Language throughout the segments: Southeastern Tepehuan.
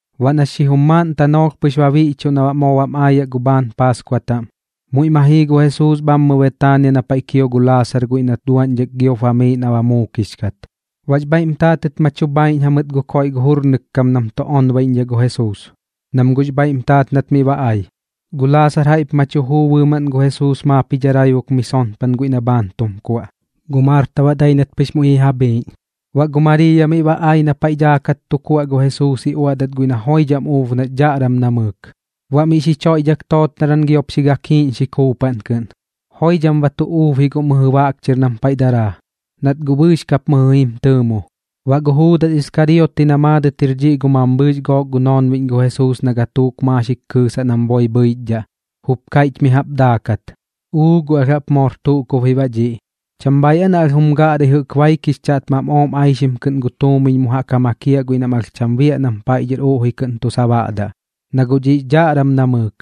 Baꞌ na xijum maaꞌn tanoolh pɨx ba biꞌchuꞌ na baꞌ moo bam aayaꞌ gu bhaan Paaskua taꞌm, muiꞌ ma jii gu Jesuus bhammɨ Betaania na paiꞌ kio gu Laasar guiꞌ nat duaꞌñdhak giop bamiiꞌ na ba muukix kat. Baꞌx bhaiꞌm taatɨt ma chu bhaiꞌñ jamɨt gu koiꞌ gu jurnɨk kam nam tu onbaiꞌñdhaꞌ gu Jesuus, nam guꞌx bhaiꞌm taat nat miꞌ ba ai. Gu Laasar jaiꞌp ma chu juu bɨɨmaꞌn gu Jesuus maap ji dharaibuk mi sonpan guiꞌ na bhaan tum kuaꞌ, gu Marta baꞌ dai nat pɨx muiꞌ ji ja bhiiꞌñ. Baꞌ gu Mariiya miꞌ ba ai na paiꞌ daakat tu kuaꞌ gu Jesuus ji uaꞌdat guiꞌ na joidham uub nax dhaꞌram namɨɨk, baꞌ miꞌ xi choiꞌdhak tootnaran giop xi gakiiꞌñxi kuupaꞌn kɨꞌn. Joidham ba tu uub ji guꞌ mɨjɨ baꞌk chɨr nam paiꞌ daraa, nat guꞌ bɨɨx kap mɨjɨ jaꞌp jim tɨɨmo. Baꞌ gu Juudas Iskariote na maadɨt jir dhiꞌ gu mambhɨɨx gook gu noonbiꞌñ gu Jesuus na gatuuk maaxik kɨɨsaꞌ nam boi bhɨichdhaꞌ, jup kaiꞌch mi jaꞌp daakat: ―¡Uu guꞌ alh jaꞌp moor tuꞌ kub ji baꞌ dhiꞌ! ¿Cham bhaiꞌ aa na alh jum gaꞌrai jɨꞌk baik jix chaꞌtmam ooꞌm aixim kɨꞌn gu tuumiñ mu jaꞌk ja makiaꞌ guiꞌ na alh cham bhaiꞌ nam paiꞌ dhɨr uꞌji kɨꞌn tu sabaꞌdaꞌ? Na guꞌ dhiꞌx dhaꞌram namɨɨk,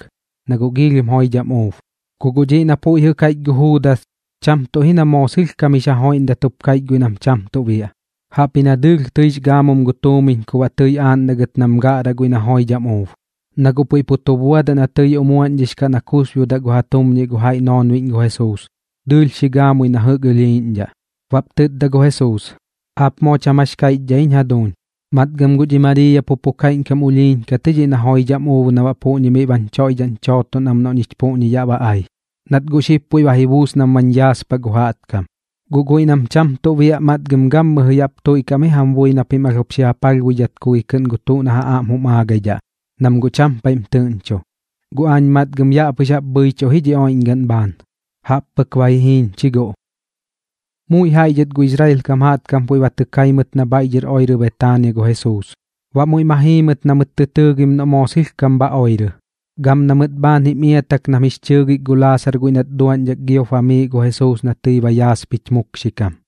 na guꞌ giilhim joidham uub. Ku guꞌ dhiꞌ na puiꞌ jɨꞌ kaiꞌch gu Juudas, cham tuꞌ ji na moo sɨlhkam jix ja joiꞌndat jup kaiꞌch guiꞌ nam cham tuꞌ biaꞌ, jaꞌpji na dɨɨlh tɨix gaamum gu tuumiñ ku baꞌ tɨi aaꞌndagɨt nam gaꞌraꞌ guiꞌ na joidham uub. Na guꞌ puiꞌ pu tu buadaꞌ na tɨi umuaꞌñdhix kaꞌ na kusbiodaꞌ gu ja tumñiꞌ gu jaiꞌ noonbiꞌñ gu Jesuus, dɨɨlh xi gaamui jɨꞌk na ɨlhiiꞌñdhaꞌ. Baꞌp tɨtda gu Jesuus: ―Aap moo cham jax kaiꞌchdhaꞌ jiñ jaduuñ. Matgam guꞌ dhi Mariiya pu pu kaiꞌñkam ulhiiñ kat ji dhiꞌ na joidham uub na baꞌ puꞌñi miꞌ bañ choiꞌdhaꞌñ chooton am noꞌ ñich yaꞌ ba ai, nat guꞌ xib puiꞌ ba ji buus nam bañ yaaspaꞌ gu jaꞌtkam. Guꞌ guiꞌ nam cham tuꞌ biaꞌ, matgam gammɨjɨ yaꞌp tuiꞌkaꞌ am ji jam bui na pim alh jup xi ja palhbuidhat ku gi kɨꞌn gu tuꞌ na ja aꞌm jum aagaidhaꞌ, nam guꞌ cham paiꞌm tɨꞌñcho. Guꞌ aañ matgam yaꞌ pɨx jaꞌp bhɨichuꞌ ji dhi oiꞌñgaꞌn bhaan, jaꞌp pɨk ba ji jiiñ chi guꞌ. Muiꞌ jaiꞌ dhɨt gu Israel kam jaꞌtkam puiꞌ ba tɨ kai mɨt na bhaiꞌ dhɨr oirɨ Betaania gu Jesuus. Baꞌ muiꞌ ma jii mɨt na mɨt tɨ tɨɨgim noꞌ moo sɨlhkam bha oirɨ, gam na mɨt bhaan jim iatak nam jix chɨɨgik gu Laasar guiꞌ nat duaꞌñdhak giop bamiiꞌ gu Jesuus na tɨi ba yaaspich mukxikam.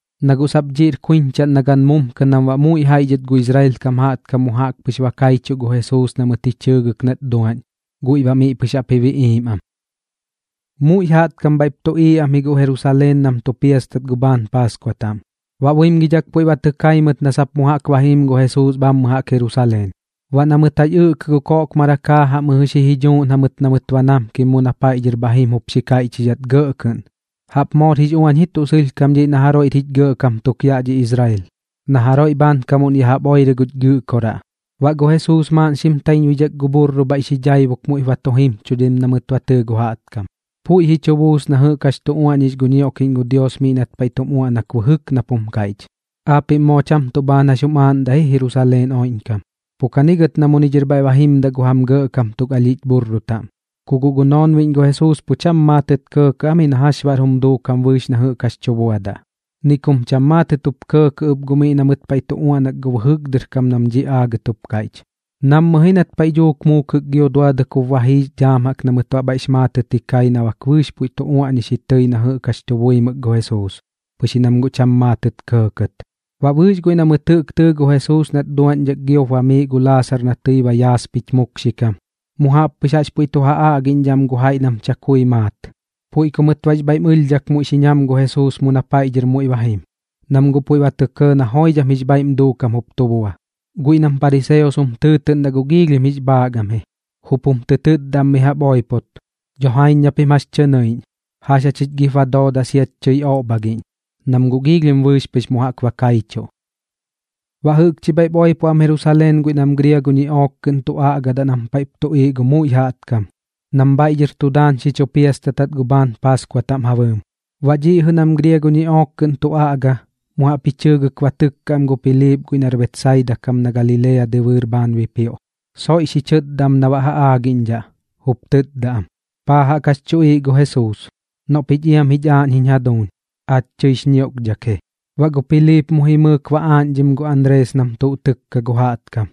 na guꞌ sap dhiꞌr kuiñchaꞌn na gan mumkɨ nam baꞌ muiꞌ jaiꞌ dhɨt gu Israel kam jaꞌtkam mu jaꞌk pɨx ba kaichuꞌ gu Jesuus na mɨt ji chɨɨgɨk nat duaꞌñ, guiꞌ baꞌ miꞌ pɨx jaꞌp ji biꞌiim am. Muiꞌ jaꞌtkam bhaiꞌp tuꞌiiꞌ am ji guꞌ Jerusaleen nam tu piastat gu bhaan paaskua taꞌm. Baꞌ buimgidhak puiꞌ ba tɨ kai mɨt na sap mu jaꞌk ba jim gu Jesuus bhammɨ jaꞌk Jerusaleen. Baꞌ na mɨt jax ɨꞌkɨ gu koꞌkmarak jaajaꞌ mɨjɨ xi ji dhuuꞌñ jamɨt na mɨt namkim mu na paiꞌ dhɨr muiꞌ ba jim jup xi kaiꞌchidhat gɇꞌ kɨꞌn: ―¡Jaꞌp moor jix uañ ji tuꞌ sɨlhkam dhiꞌ na jaroiꞌr jich gɇꞌkam tuk yaꞌ dhi Israel, na jaroiꞌ bhaankamuꞌn ya jaꞌp oirɨ guch Gɨꞌkoraꞌ! Baꞌ gu Jesuus maaꞌn xim taiñbuidhak gu bhurru bhaiꞌ xi dhaibuk muiꞌp ba tu jimchudim na mɨt ba tɨɨ gu jaꞌtkam. Puiꞌ ji chu buus na jɨꞌk jax tu uaꞌñix gu ñioꞌkiꞌñ gu Dios miꞌ nat paiꞌ tum uaꞌnak bɨjɨk nap jum kaiꞌch: Aapiꞌm moo cham tuꞌ bhaan jax jum aaꞌndaꞌ ji Jerusaleen oiꞌñkam. Pu kani gɨt na miꞌñi dhɨr bhaiꞌ ba jimdaꞌ gu jam gɇꞌkam tuk alhiꞌch bhurru taꞌm. Ku guꞌ gu noonbiꞌñ gu Jesuus pu cham maatɨt kɇɇkɇꞌ am ji na jax baꞌr jum duukam bɨɨx na jɨꞌk jax tu buadaꞌ, ni kum cham maatɨt kɇɇkɇꞌ ɨp guꞌ miꞌ na mɨt paiꞌ tu uaꞌnak gu bɨjɨk dɨr kam nam dhiꞌ aagɨt jup kaiꞌch. Nammɨ ji nat paiꞌ dhuuk muukɨk gio duadɨk jup ba jiix dhaam na mɨt baꞌ bhaiꞌx maatɨt ji kai na bak bɨɨx puiꞌ tu uaꞌñix ji tɨi na jɨꞌk jax tu buimɨk gu Jesuus, pɨx ji nam guꞌ cham maatɨt kɇɇkɇt. Baꞌ bɨɨx guiꞌ na mɨt jɨꞌk tɨɨ gu Jesuus nat duaꞌñdhak giop bamiiꞌ gu Laasar na tɨi ba yaaspich mukxikam, mu jaꞌp pɨx jaꞌx puiꞌ tu ja aꞌgiꞌñdhaꞌ am gu jaiꞌ nam chakui maat. Puiꞌ ku mɨt baꞌx bhaiꞌm ɨlhdhak muiꞌ xi ñam gu Jesuus mu na paiꞌ dhɨr muiꞌ ba jim, nam guꞌ puiꞌ ba tɇ kɇɇ na joidham jix bhaiꞌm duukam jup tu bua. Guꞌ guiꞌ nam pariseos jum tɨɨtɨꞌndaꞌ guꞌ giilhim jix bhaak am ji, jup jum tɨ tɨtdaꞌ am mi jaꞌp oipot: ―¡Dho jaiñ na pim jax tɨ nɨiꞌñ! ¿Jax jachich gip ba dooda siach chɨi oꞌbhagiꞌñ? Nam guꞌ giilhim bɨɨx pɨx mu jaꞌk ba kaichuꞌ. Baꞌ jɨꞌkchi bhaiꞌp oipo am Jerusaleen guiꞌ nam griago ñiꞌook kɨꞌn tu aꞌgadaꞌ nam paiꞌp tuꞌiiꞌ gu muiꞌ jaꞌtkam, nam bhaiꞌ dhɨr tu daan xi chu piastatdat gu bhaan Paaskua taꞌm ja bɨɨm. Baꞌ dhiꞌ jɨꞌ nam griago kɨꞌn tu aꞌga, mu jaꞌp ji chɨɨgɨk ba tɨkka am gu Piliip guiꞌ nar Betsaida kam na Galilea dɨbɨɨr bhaan bipioꞌ, soiꞌ xi chɨtda am na baꞌ ja aagiꞌñdhaꞌ, jup tɨtda am: ―¿Paa jaꞌk jax chuꞌiiꞌ gu Jesuus? Noꞌ pich iam jich aaꞌñ jiñ jaduuñ. Aach tɨix ñioꞌkdhak ji. Baꞌ gu Piliip mu jimɨɨk ba aaꞌñdhim gu Anrees nam tuꞌ tɨkka gu jaꞌtkam,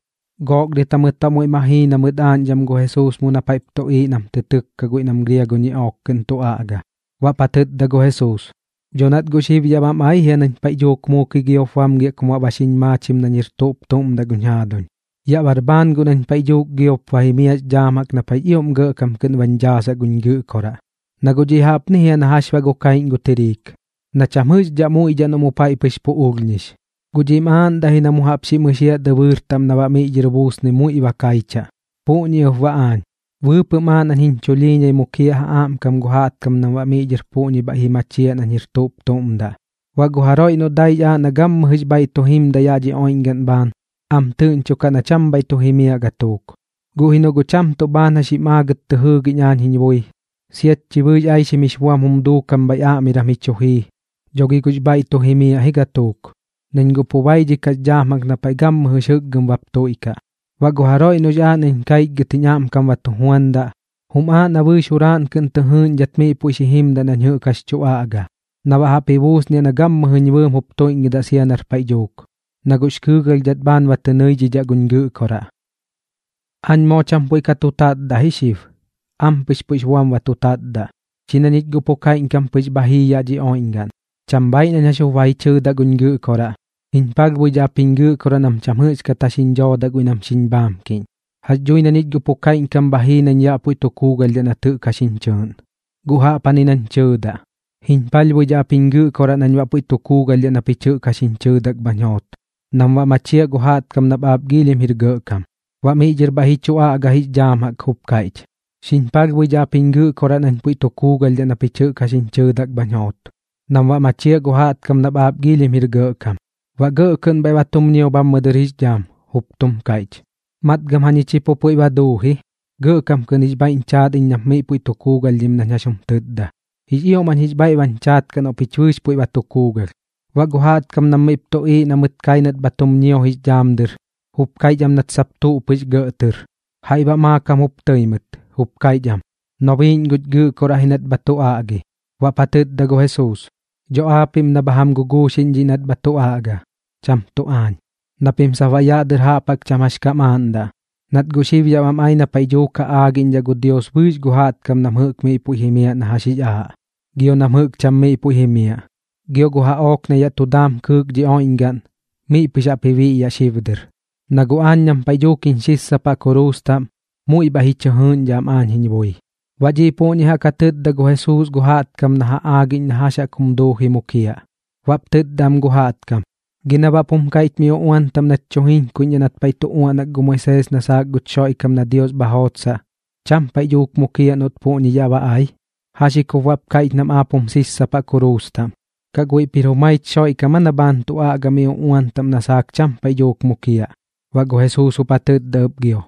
gook dɨt jamɨt baꞌ muiꞌ ma jii na mɨt aaꞌñdham gu Jesuus mu na paiꞌp tuꞌiiꞌ nam tɨ tɨkka guiꞌ nam griago ñiꞌook kɨꞌn tu aꞌga. Baꞌp ja tɨtda gu Jesuus: ―Dho nat guꞌ xib yaꞌ bam ai jia nañ paiꞌ dhuuk muukɨi giop bamgiaꞌ kum baꞌ ba xiñ maachim nañ jir tuꞌp tuꞌm daꞌ guñ jaaduñ. Yaꞌ bar bhaan guꞌ nañ paiꞌ dhuuk giop ba jimiaꞌx dhaam na paiꞌx ioꞌm gɇꞌkam kɨꞌn bañ dhaasaꞌ guñ Gɨꞌkoraꞌ. Na guꞌ dhiꞌ jaꞌpni jia na jax baꞌ gu kaiꞌñ gu tiriik, na cham jɨꞌxdhaꞌ muiꞌdhaꞌ noꞌ mu paiꞌ pɨx pu ulhñix, guꞌ dhiꞌm aaꞌndaꞌ ji na mu jaꞌp jum ɨxiaꞌ dɨbɨɨr taꞌm na baꞌ miꞌ dhɨr buusnɨi muiꞌ ba kaichaꞌ. Puꞌñi ɨp baꞌ aañ, bɨɨpɨꞌm aaꞌ nañ jiñ chulhiiñai mukiaꞌ ja aꞌmkam gu jaꞌtkam nam baꞌ miꞌ dhɨr puꞌñi bhaiꞌ ji machiaꞌ nañ jir tuꞌp tuꞌm daꞌ. Baꞌ gu jaroiꞌ noꞌ daix aaꞌ na gammɨjɨx bhaiꞌ tu jimdaꞌ yaꞌ dhi oiꞌñgaꞌn bhaan, am tɨꞌñchokaꞌ na cham bhaiꞌ tu jimiaꞌ gatuuk. Guꞌ ji noꞌ guꞌ cham tuꞌ bhaan jax jim aagat tɨ jɨɨgiꞌñ aañ jiñ bui, siat chi bɨɨx aixim jix buam jum duukam bhaiꞌ aꞌmiram ji chu jii, dho gi guꞌx bhaiꞌ tu jimiaꞌ ji gatuuk, nañ guꞌ pu baidhikaꞌx dhaam na paiꞌ gammɨjɨx jɨkgɨm bap tuiꞌkaꞌ. Baꞌ gu jaroiꞌ noꞌx aaꞌ nañ kaichgɨt jiñ aꞌmkam ba tu juandaꞌ, jum aaꞌ na bɨɨx juraaꞌn kɨꞌn tɨ jɨɨꞌñdhat miꞌ puiꞌ xi jimdaꞌ nañ jɨꞌk jax tu aꞌga, na baꞌ jaꞌp ji buusniaꞌ na gammɨjɨñ bɨɨm jup tuiꞌñgɨdaꞌ sia nar paiꞌ dhuuk, na guꞌx kɨɨgalhdhat bhaan ba tɨ nɨidhidhaꞌ guñ Gɨꞌkoraꞌ. ’Aañ moo cham puiꞌ ka tu tatdaꞌ ji xib, ampɨx puiꞌx buam tu tatdaꞌ. Chi na ñich guꞌ pu kaiꞌñkam pɨx bha jii yaꞌ dhi oiꞌñgaꞌn, cham bhaaiꞌ nañ jax jup ba ji chɨɨdaꞌ guñ Gɨꞌkoraꞌ: “Jiñ palhbuidhaꞌ ap jiñ Gɨꞌkoraꞌ nam cham jɨꞌxkat jax jiñ dhoodaꞌ guiꞌ nam xiñ bhaamkiꞌñ.” Jax dhui na ñich guꞌ pu kaiꞌñkam bha jii nañ yaꞌ puiꞌ tu kuugalhdhaꞌ nat jɨꞌk jax jiñ chɨɨꞌn. Guꞌ jaꞌpjani nañ tɨɨdaꞌ: “Jiñ palhbuidhaꞌ ap jiñ Gɨꞌkoraꞌ nañ baꞌ puiꞌ tu kuugalhdhaꞌ na pich jɨꞌk jax jiñ chɨɨdak bhañ joot, nam baꞌ machiaꞌ gu jaꞌtkam nap aap giilhim jir gɇꞌkam.” Baꞌ miꞌ dhɨr bhaiꞌ ji chu aꞌga jix dhaam jaꞌk jup kaiꞌch: ―Xiñ palhbuidhaꞌ ap jiñ Gɨꞌkoraꞌ nañ puiꞌ tu kuugalhdhaꞌ na pich jax jiñ chɨɨdak bhañ joot, nam baꞌ machiaꞌ gu jaꞌtkam nap aap giilhim jir gɇꞌkam. Baꞌ gɇꞌ kɨꞌn bhaiꞌ ba tum ñio bhammɨ dɨr jix dhaam jup tum kaiꞌch: ―Matgam jañich pu puiꞌ ba duu ji. Gɇꞌkam kɨꞌn jix bhaiꞌñ chaat iñ nap miꞌ puiꞌ tu kuugalhdhim nañ jax jum tɨtda. Jix ioꞌm jañ jix bhaiꞌ bañ chaat kaꞌ noꞌ pich bɨɨx puiꞌ ba tu kuugalh. Baꞌ gu jaꞌtkam nam miꞌp tuꞌiiꞌ na mɨt kai nat bha tum ñio jix dhaam dɨr, jup kaiꞌch am nat sap tuꞌ pɨx gɇꞌ tɨr. Jaiꞌ baꞌ maakam jup tɨi mɨt, jup kaiꞌch am: ―Nobiiꞌñ guch Gɨꞌkoraꞌ ji nat bha tu aꞌgi. Baꞌp ja tɨtda gu Jesuus: ―Dho aapiꞌm na bha jam guguuxiꞌñ dhiꞌ nat bha tu aꞌga, cham tuꞌ aañ, na pim sap baꞌ yaꞌ dɨr jaꞌp jaꞌk cham jax kam aaꞌndaꞌ. Nat guꞌ xib yaꞌ bam ai na paiꞌ dhuuk ja aagiꞌñdhaꞌ gu Dios bɨɨx gu jaꞌtkam nam jɨꞌk miꞌ puiꞌ jimiaꞌ na jax jix aaꞌ, gio nam jɨꞌk cham miꞌ puiꞌ jimiaꞌ. Gio gu jaꞌook na yaꞌ tu daam kɨɨk dhi oiꞌñgaꞌn, miꞌ pɨx jaꞌp ji biꞌyaꞌ xib dɨr. Na guꞌ aañ nam paiꞌ dhuuk jiñ xissapaꞌ kuruus taꞌm, muiꞌ bhaiꞌ ji chɨ jɨɨꞌñdhaꞌ am aañ jiñ bui. Baꞌ dhiꞌ puꞌñi jaꞌk ja tɨtda gu Jesuus gu jaꞌtkam na ja aagiꞌñ na jax jaꞌk jum duuji mukiaꞌ. Baꞌp tɨtda am gu jaꞌtkam: ―¿Gi na baꞌp jum kaiꞌch mi uꞌuan taꞌm nach tu jiñkuiꞌñdhaꞌ nat paiꞌ tu uaꞌnak gu Moisees na saak guch Xoiꞌkam na Dios bha jootsaꞌ, cham paiꞌ dhuuk mukiaꞌ noꞌt puꞌñi yaꞌ ba ai? ¿Jax ji kup baꞌp kaiꞌch nam aap jum sissapaꞌ kuruus taꞌm? ¿Kaꞌ guiꞌp jir jumaich Xoiꞌkam aa na bhaan tu aꞌga mi uꞌuan taꞌm na saak cham paiꞌ dhuuk mukiaꞌ? Baꞌ gu Jesuus jup ja tɨtda ɨp gio: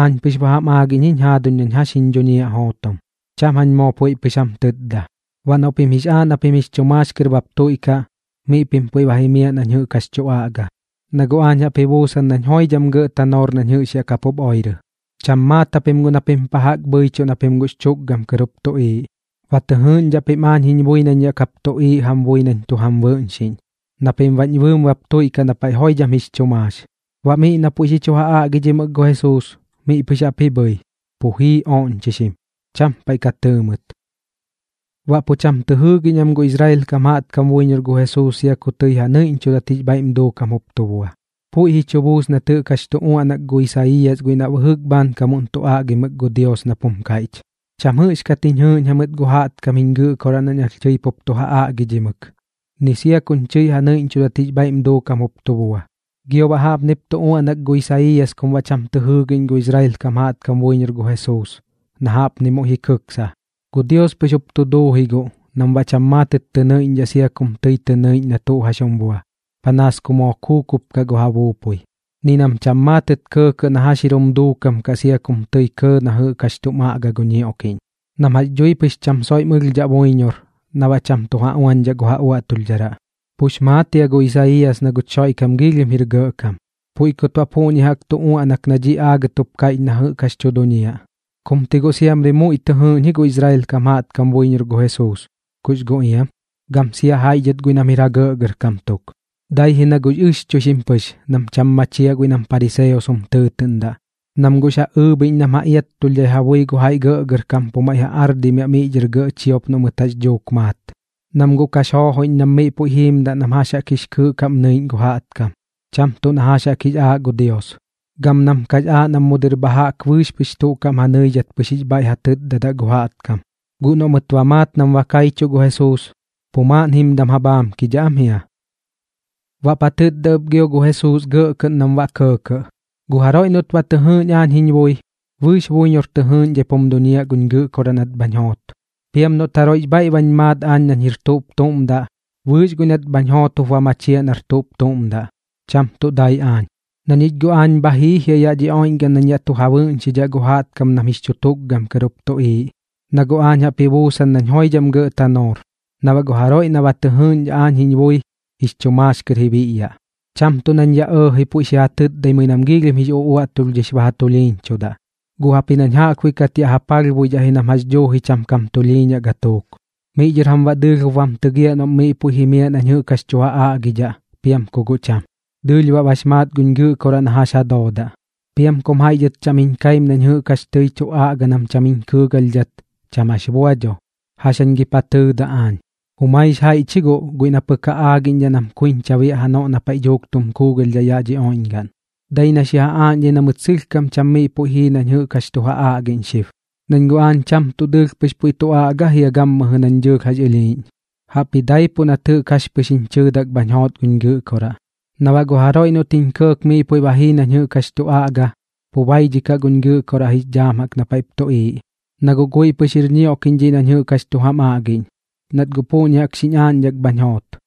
―Aañ pɨx ba jam aagiꞌñ iñ jiñ jaaduñ nañ jax jiñ dhuñiaꞌ jootom, cham jañ moo puiꞌ pɨx jam tɨtda. Baꞌ noꞌ pim jix aaꞌ na pim jix chu maax kɨr bap tuiꞌkaꞌ, miꞌ pim puiꞌ ba jimiaꞌ nañ jɨꞌk jax tu aꞌga, na guꞌ aañ jaꞌp ji buusan nañ joidham gɇꞌ tanoor nañ jɨꞌx yaꞌ kapup oirɨ. Cham maat japim guꞌ na pim pa jaꞌk bhɨichuꞌ na pim guꞌx chu tukgam kɨr jup tuꞌiiꞌ. Ba tɨ jɨɨꞌñdhaꞌ pim aañ jiñ bui nañ yaꞌ kap tuꞌiiꞌ jam bui nañ tu jam bɨꞌñxiꞌñ, na pim baꞌñ bɨɨm bap tuiꞌkaꞌ na paiꞌ joidham jix chu maax. Baꞌ miꞌ na puiꞌ xi chu ja aꞌgidhimɨk gu Jesuus, miꞌ pɨx jaꞌp ji bhɨi, pu jii oꞌñchixim. Cham paiꞌ ka tɨɨ mɨt. Baꞌ pu cham tɨ jɨɨgiꞌñ am gu Israel kam jaꞌtkam buiñor gu Jesuus sia ku tɨi ja nɨiꞌñchudat jix bhaiꞌm duukam jup tu bua. Puiꞌ ji chu buus nat jɨꞌk jax tu uaꞌnak gu Isaiiyas guiꞌ na bɨjɨk bhaankamuꞌn tu aꞌgimɨk gu Dios, nap jum kaiꞌch: Cham jɨꞌxkat jiñ jɨɨꞌñ jamɨt gu jaꞌtkam jiñ Gɨꞌkoraꞌ nañ alh tɨi pup tu ja aꞌgidhimɨk, ni sia kuñ chɨi ja nɨiꞌñchudat jix bhaiꞌm duukam jup tu bua. Gio baꞌ jaꞌpnip tu uaꞌnak gu Isaiiyas kum baꞌ cham tɨ jɨɨgiꞌñ gu Israel kam jaꞌtkam buiñor gu Jesuus, na jaꞌpni muiꞌ ji kɨksa: Gu Dios pɨx jup tu duu ji guꞌ nam baꞌ cham maatɨt tɨ nɨiꞌñdhaꞌ sia kum tɨi tɨ nɨiꞌñ na tuꞌ jax jum bua, panaas ku moo kuukup kaꞌ gu ja buupui, ni nam cham maatɨt kɇɇkɇꞌ na jax jir jum duukam kaꞌ sia kum tɨi kɇɇ na jɨꞌk jax tum aꞌga gu ñioꞌkiꞌñ, nam jax dhui pɨx cham soiꞌm ɨlhdhaꞌ buiñor na baꞌ cham tu ja uañdhaꞌ gu ja uaꞌtulhdharaꞌ. Pux maat jia gu Isaiiyas na guch Xoiꞌkam giilhim jir gɇꞌkam, puiꞌ kut baꞌ puꞌñi jaꞌk tu uaꞌnak na dhiꞌ aagɨt jup kaiꞌch na jɨꞌk jax tu duñiaꞌ. Kum ti guꞌ moo siamri muiꞌ tɨ jɨɨꞌñ ji gu Israel kam jaꞌtkam buiñor gu Jesuus, kux guꞌ iam, gam sia jaiꞌ dhɨt guiꞌ nam jir ja gɇꞌgɇrkam tuk. Dai ji na guꞌx ɨxchuixim pɨx nam cham machiaꞌ guiꞌ nam pariseos jum tɨɨtɨꞌndaꞌ, nam guꞌx ja ɨɨbhiꞌñ nam ja iattulhdhai ja bui gu jaiꞌ gɇꞌgɇrkam pu maiꞌ ja ardimiaꞌ miꞌ dhɨr gɇꞌ chiop noꞌ mɨt jax dhuuk maat. Nam guꞌ kax joojoiꞌñ nam miꞌ puiꞌ jiimdaꞌ nam jax jaꞌk jix kɨɨꞌ kaꞌm nɨiꞌñ gu jaꞌtkam, cham tuꞌ na jax jaꞌk jix aaꞌ gu Dios, gam nam kax aaꞌ nam mu dɨr bha jaꞌk bɨɨx pɨx tuꞌ kaꞌm ja nɨidhat pɨx jix bhaiꞌ ja tɨtdadaꞌ gu jaꞌtkam. Guꞌ noꞌ mɨt ba maat nam ba kaichuꞌ gu Jesuus, pu maaꞌn jimdam ja bhaamkidhaꞌ am jia. Baꞌp ja tɨtda ɨp gio gu Jesuus gɇꞌ kɨꞌn nam baꞌ kɇɇkɇꞌ: ―Gu jaroiꞌ noꞌt ba tɨ jɨɨꞌñ aañ jiñ bui, bɨɨx buiñor tɨ jɨɨꞌñdhaip jum duñiaꞌ guñ Gɨꞌkoraꞌ nat bhañ joot. Piam noꞌt jaroiꞌx bhaiꞌ bañ maat nañ jir tuꞌp tuꞌm daꞌ, bɨɨx guiꞌ nat bhañ joot jup ba machiaꞌ nar tuꞌp tuꞌm daꞌ, cham tuꞌ dai aañ. Na ñich guꞌ aañ bha jii jia yaꞌ dhi oiꞌñgaꞌn nañ yaꞌ tu ja bɨꞌñxidhaꞌ gu jaꞌtkam nam jix chu tukgam kɨr jup tuꞌiiꞌ, na guꞌ aañ jaꞌp ji buusan nañ joidham gɇꞌ tanoor, na baꞌ gu jaroiꞌ na ba tɨ jɨɨꞌñdhaꞌ aañ jiñ bui, jix chu maax kɨr ji biꞌyaꞌ. Cham tuꞌ nañ aañ yaꞌ ɇɇji puiꞌ xi ja tɨtdaimɨi nam giilhim jix uꞌuaꞌtulhdhix ba ja tulhiiñchudaꞌ, guꞌ jaꞌpji nañ jaꞌkbuiꞌ kat yaꞌ ja palhbuidhaꞌ ji nam jax dhuuji cham jum tulhiiñaꞌ gatuuk. Miꞌ dhɨr jam baꞌ dɨɨlh jup bam tɨgiaꞌ noꞌ miꞌ puiꞌ jimiaꞌ nañ jɨꞌk jax tu ja aꞌgidhaꞌ, piam ku guꞌ cham. Dɨɨlh baꞌ bax maat guñ Gɨꞌkoraꞌ na jax ja doodaꞌ. Piam kum jaiꞌ dhɨt cham jiñ kaim nañ jɨꞌk jax tɨi tu aꞌga nam cham jiñ kɨɨgalhdhat, cham jax bua dho. ¿Jax jañ gip ja tɨɨdaꞌ aañ? Jumaix jaiꞌch ji guꞌ guiꞌ na pɨk ja aagiꞌñdhaꞌ nam kuiñcha biaꞌ janoꞌ na paiꞌ dhuuk tum kuugalhdhaꞌ yaꞌ dhi oiꞌñgaꞌn, dai na xi ja aaꞌñdhai na mɨt sɨlhkam cham miꞌ puiꞌ jii nañ jɨꞌk jax tu ja aꞌgiꞌñ xib. Nañ guꞌ aañ cham tuꞌ dɨɨlh pɨx puiꞌ tu aꞌga jia gammɨjɨ nañ dɨɨlh jax ɨlhiiꞌñ, jaꞌpji daipuꞌ nat jɨꞌk jax pɨx jiñ chɨɨdak bhañ joot guñ Gɨꞌkoraꞌ. Na baꞌ gu jaroiꞌ noꞌt jiñ kɇɇk miꞌ puiꞌ ba jii nañ jɨꞌk jax tu aꞌga, pu baidhikaꞌ guñ Gɨꞌkoraꞌ jix dhaam jaꞌk na paiꞌp tuꞌiiꞌ, na guꞌ guiꞌ pɨx jir ñioꞌkiꞌñ dhiꞌ nañ jɨꞌk jax tu jam aꞌgiꞌñ, nat guꞌ puꞌñi jaꞌk xiñ aaꞌñdhak bhañ joot.